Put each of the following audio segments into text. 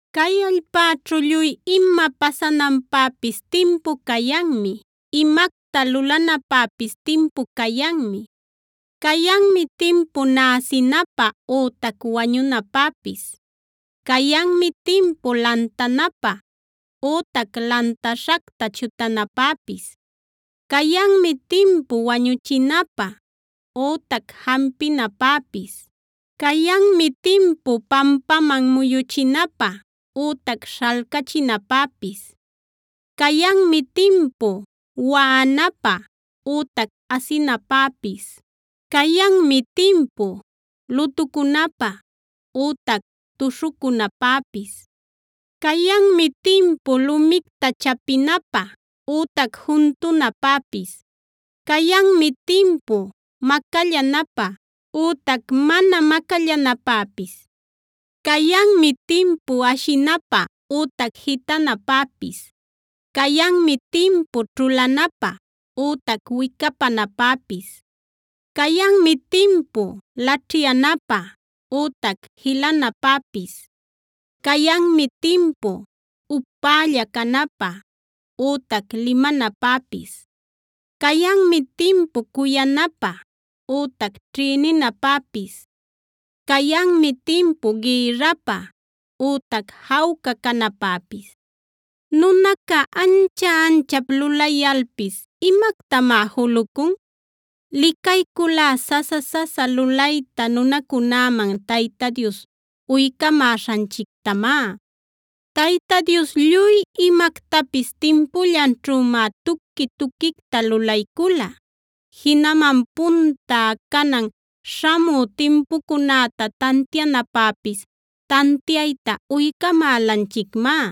Cay allpäćhu lluy ima pasananpäpis timpu cayanmi; imacta lulanapäpis timpu cayanmi: Cayanmi timpu näsinapä ütac wañunapäpis. Cayanmi timpu lantanapä ütac lantaśhacta chutanapäpis. Cayanmi timpu wañuchinapä ütac jampinapäpis. Cayanmi timpu pampaman muyuchinapä ütac śhalcachinapäpis. Cayanmi timpu waꞌanapä ütac asinapäpis. Cayanmi timpu lutucunapä ütac tuśhucunapäpis. Cayanmi timpu lumicta chapinapä ütac juntunapäpis.a Cayanmi timpu macallanapä ütac mana macallanapäpis. Cayanmi timpu ashinapä ütac jitanapäpis. Cayanmi timpu ćhulanapä ütac wicapanapäpis. Cayanmi timpu laćhyanapä ütac jilanapäpis. Cayanmi timpu upälla canapä ütac limanapäpis. Cayanmi timpu cuyanapä ütac ćhïninapäpis. Cayanmi timpu gïrrapä ütac jawca canapäpis. ¿Nunaca ancha-anchap lulayalpis imactamá julucun? Licayculá sasa-sasa lulayta nunacunäman Tayta Dios uycamäśhanchictamá. Tayta Dios lluy imactapis timpullanćhümá tuqui-tuquicta lulaycula. Jinaman punta, canan, śhamü timpucunäta tantianapäpis tantiayta uycamälanchicmá.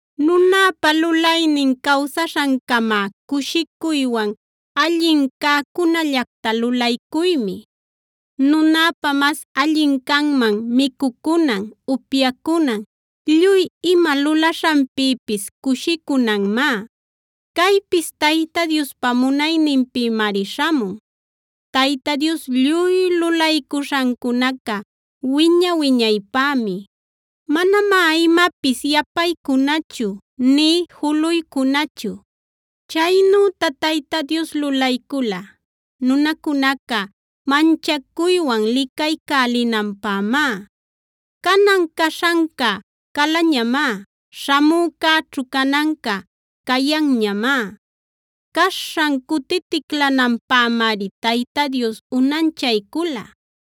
Nunäpa lulaynin cawsaśhancamá cushicuywan allin cäcunällacta lulaycuymi. Nunäpä mas allin canman micucunan, upyacunan, lluy ima lulaśhanpïpis cushicunanmá. Caypis Tayta Diospa munayninpïmari śhamun. Tayta Dios lluy lulaycuśhancunaca wiña-wiñaypämi.c Manamá imapis yapaycunachu nï juluycunachu. Chaynüta Tayta Dios lulaycula nunacunaca manchacuywan licaycälinanpämá. Canan caśhanca calañamá; śhamücäćhu cananca cayanñamá. Caśhan cutiticlalinanpämari Tayta Dios unanchaycula.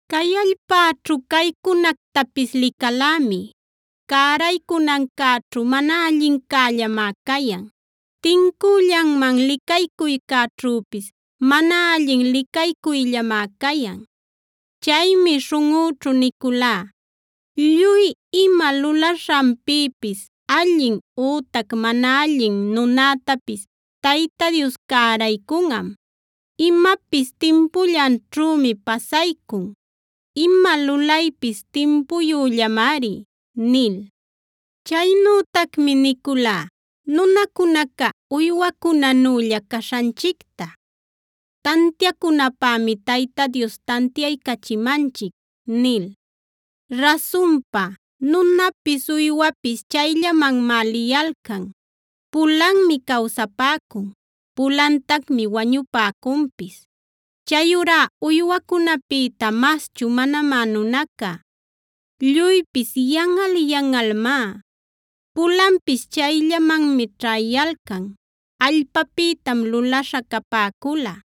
Cay allpäćhu caycunactapis licalämi: Cäraycunancäćhu mana allincällamá cayan; tincüllanman licaycuycäćhüpis mana allin licaycuyllamá cayan. Chaymi śhunꞌüćhu niculá: “Lluy ima lulaśhanpïpis allin ütac mana allin nunätapis Tayta Dios cäraycunꞌam. Imapis timpullanćhümi pasaycun; ima lulaypis timpuyüllamari” nil. Chaynütacmi niculá: “Nunacunaca uywacunänülla caśhanchicta tantiacunapämi Tayta Dios tantiaycachimanchic” nil. Rasunpa, nunapis uywapis chayllamanmá liyalcan. Pulanmi cawsapäcun; pulantacmi wañupäcunpis.d Chayurá uywacunäpïta maschu manamá nunaca. Lluypis yanꞌal-yanꞌalmá. Pulanpis chayllamanmi ćhäyalcan: Allpapïtam lulaśha capäcula;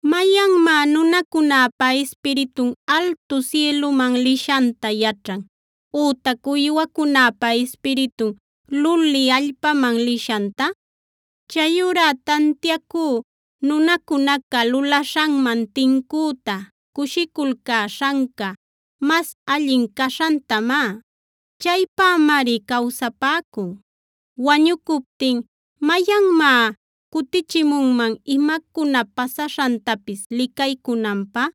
¿Mayanmá nunacunäpa ispiritun altu sïlüman lishanta yaćhan ütac uywacunäpa ispiritun luli allpäman lishanta?f Chayurá tantiaycú nunacunaca lulaśhanman tincüta cushiculcäśhanca mas allin caśhantamá; chaypämari cawsapäcun. Wañucuptin ¿mayanmá cutichimunman imacuna pasaśhantapis licaycunanpä?